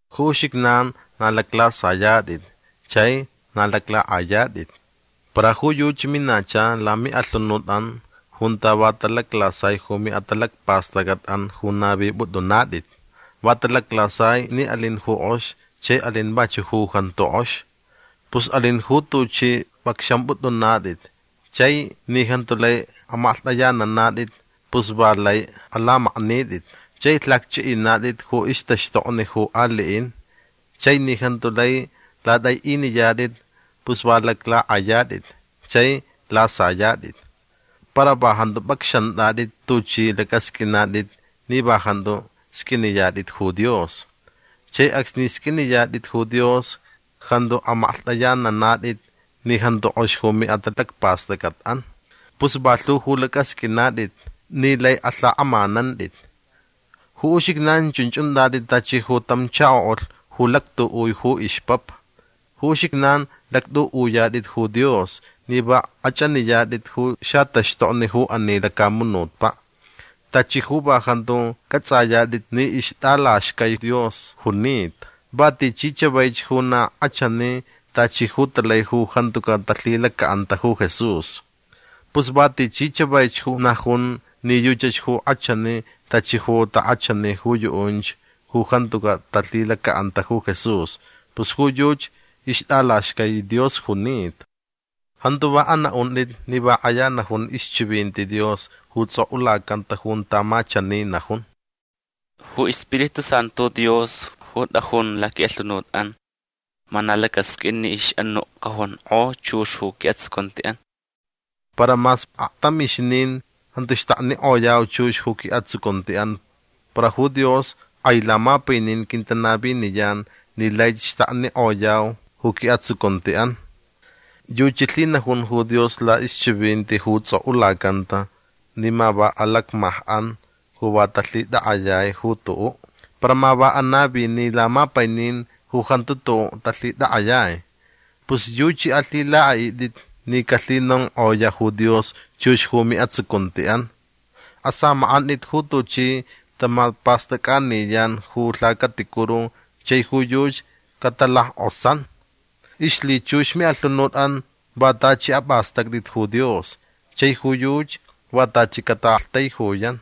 Ju uxijnan na laclasayatʼit chai na laclakʼayatʼit. Para ju yuchi minacha lamiʼalhunutʼan junta va talaclasai ju miʼatalacpastʼacʼatʼan ju navipʼutʼunatʼit. Va talaclasai ni alin ju kʼox chai alin vachuʼ ju jantu kʼox. Pus alin ju tuchʼi pʼacxampʼutʼunatʼit chai ni jantu lai amaklhtʼayananatʼit pus va lai alamaknitʼit. Chai lhacchʼiʼinatʼit ju ixtaxtokni ju aliʼin chai ni jantu lai latʼaiʼiniyatʼit pus va laclakʼayatʼit chai lasayatʼit. Para va jantu pʼacxantʼatʼit tuchʼi lacʼasqʼuinatʼit ni va jantu sqʼuiniyatʼit ju Dios. Chai acsni sqʼuiniyatʼit ju Dios jantu amaklhtʼayananatʼit ni jantu kʼox ju miʼatalacpastʼacʼatʼan. Pus va lhu ju lacʼasqʼuinatʼit ni lai alhakʼamanantʼit. Ju uxijnan chunch untʼatʼit tachi ju tam chakoʼulh ju lactuʼui ju ixpapa. Ju uxijnan lactʼuʼuyatʼit ju Dios ni va kʼachʼaniyatʼit ju xataxtokni ju ani lacamunutpaʼ. Tachi ju va jantu cʼatsʼayatʼit ni ixtʼalaxcai Dios junita va tichi chavaich ju na kʼachani tachi ju talai ju jantucaʼ talhilacaʼanta ju Jesús. Pus va tichi chavaich ju najun ni yuchach ju kʼachani tachi ju takʼachani ju yuʼunch ju jantucaʼ talhilacaʼanta ju Jesús pus ju yuchi ixtʼalaxcai Dios junita. Jantu va anaʼuntʼit ni va kʼaya najun ixchivinti Dios ju tsʼokʼulacanta junta ma chani najun: “Ju iSpiritu Santu Dios ju tʼajun laquiʼalhunutʼan ma na lacasqʼuin ni ixʼanuʼ cajonkʼo chux ju quiʼatsucuntiʼan”. Para mas aktamixnin jantu xtaknikʼoyau chux ju quiʼatsucuntiʼan para ju Dios kʼai lamapainin quintanaviniyan ni laich xtaknikʼoyau ju quiʼatsucuntiʼan. Yuchi lhinajun ju Dios laʼixchivinti ju tsʼokʼulacanta ni ma va alacmajkʼan ju va talhitakʼayai ju tuʼuʼ. Para ma anavini lamapainin ju jantu tuʼuʼ talhitakʼayai. Pus yuchi alhilakʼaʼitʼit ni calhinonkʼoyaʼ ju Dios chux ju miʼatsucuntiʼan. Asamakʼantʼit ju tuchi tamapastʼacʼaniyan ju lhacaticuru chai ju yuchi catalackʼosan. Ixlhichux miʼalhunutʼan va tachi apʼastʼactʼit ju Dios chai ju yuchi va tachi cataʼaktaijuyan.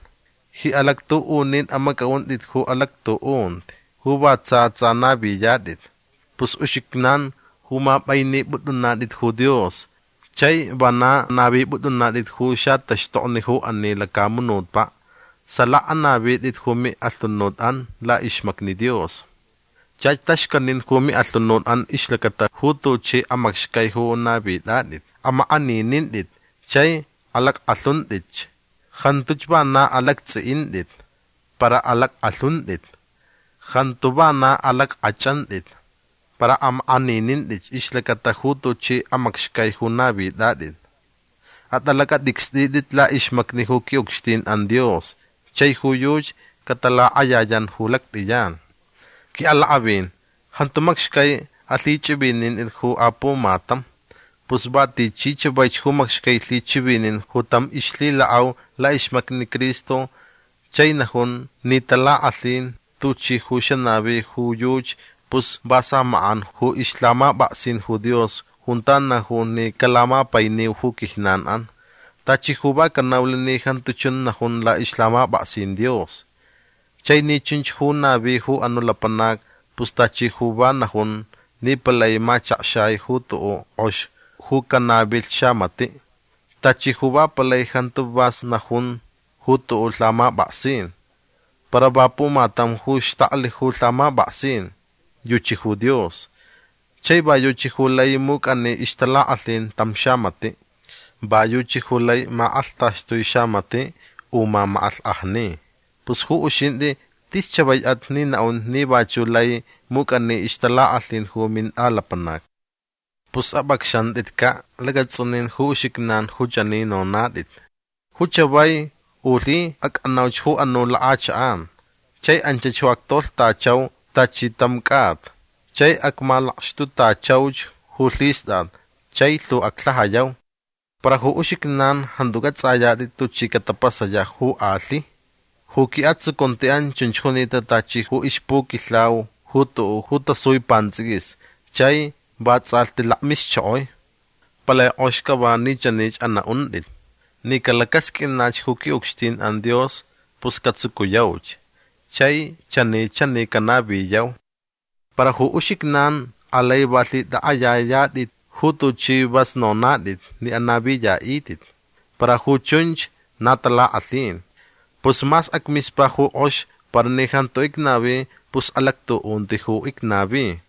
Ji alactuʼunin amacʼaʼuntʼit ju alactuʼunti ju va tsa tsa naviyatʼit. Pus uxijnan ju mapʼainipʼutʼunatʼit ju Dios chai vana navipʼutʼunatʼit ju xataxtokni ju ani lacamunutpaʼ salaka anavitʼit ju miʼalhunutʼan laʼixmacni Dios. Chach taxcanin ju miʼalhunutʼan ixlacata ju tuchi amacxcai ju navitʼatʼit. Amakʼaninintʼit chai alackʼalhuntʼitch. Jantuch vana alactsʼiʼintʼit. Para alackʼalhuntʼit. Jantu vana alackʼachʼantʼit. Para amakʼaninintʼitch ixlacata ju tuchi amacxcai ju navitʼatʼit. Atʼalacʼatʼicstʼitʼit laʼixmacni ju quiʼucxtinʼan Dios chai ju yuchi catalakʼayayan ju lactʼiyan. Quiʼalakʼavin jantu macxcai alhichʼivinintʼit ju apumatam. Pus va tichi chavaich ju macxcai lhichivinin ju tam ixlhilakʼau laʼixmacni Cristo chai najun ni talakʼalhin tuchi ju xanavi ju yuchi pus va samakʼan ju ixlhamapʼaksin ju Dios junta najun ni calamapainiu ju quijnanʼan. Tachi ju va canaulh ni jantu chun najun laʼixlhamapʼaksin Dios. Chai ni chunch ju navi ju anuʼ lapanac pus tachi ju va najun ni palai machakxai ju tuʼuʼ kʼox ju canavilh xamatiʼ. Tachi ju va palai jantu vas najun ju tuʼuʼ lhamapʼaksin. Para va pumatam ju xtaklh ju lhamapʼaksin. Yuchi ju Dios. Chai va yuchi ju lai mucʼani ixtalakʼalhin tam xamatiʼ. Va yuchi ju lai makʼalhtaxtui xamatiʼ u mamakʼalhkʼajni. Pus ju uxintʼi tis chavaichʼat ni naʼun ni vachuʼ lai mucʼani ixtalakʼalhin ju mintʼalapanac. Pus apʼacxantʼitcaʼ lacatsʼunin ju uxijnan ju chani nonatʼit: “Ju chavai u lhi acʼanauch ju anuʼ lakʼachakʼan. Chai anchach ju actolhtachau tachi tam cʼata. Chai acmalakxtutachauch ju lhistʼat chai lhu aclhajayau”. Para ju uxijnan jantu cʼatsʼayatʼit tuchi catapasayaʼ ju alhi. Ju quiʼatsucuntiʼan chunch junita tachi ju ixpuquilhau ju tuʼuʼ ju tasui pantsʼiquis chai vatsʼalhti lakmixchokoi. Palai kʼox cava ni chanich anaʼuntʼit: “Ni calacasqʼuinach ju quiʼucxtinʼan Dios pus catsucuyauch chai chani chani canaviyau”. Para ju uxijnan alai va lhitʼakʼayayatʼit ju tuchi vas nonatʼit ni anaviyaʼitʼit. Para ju chunch na talakʼalhin. Pus mas acmispa ju kʼox para ni jantu icnavi pus alactuʼunti ju icnavi.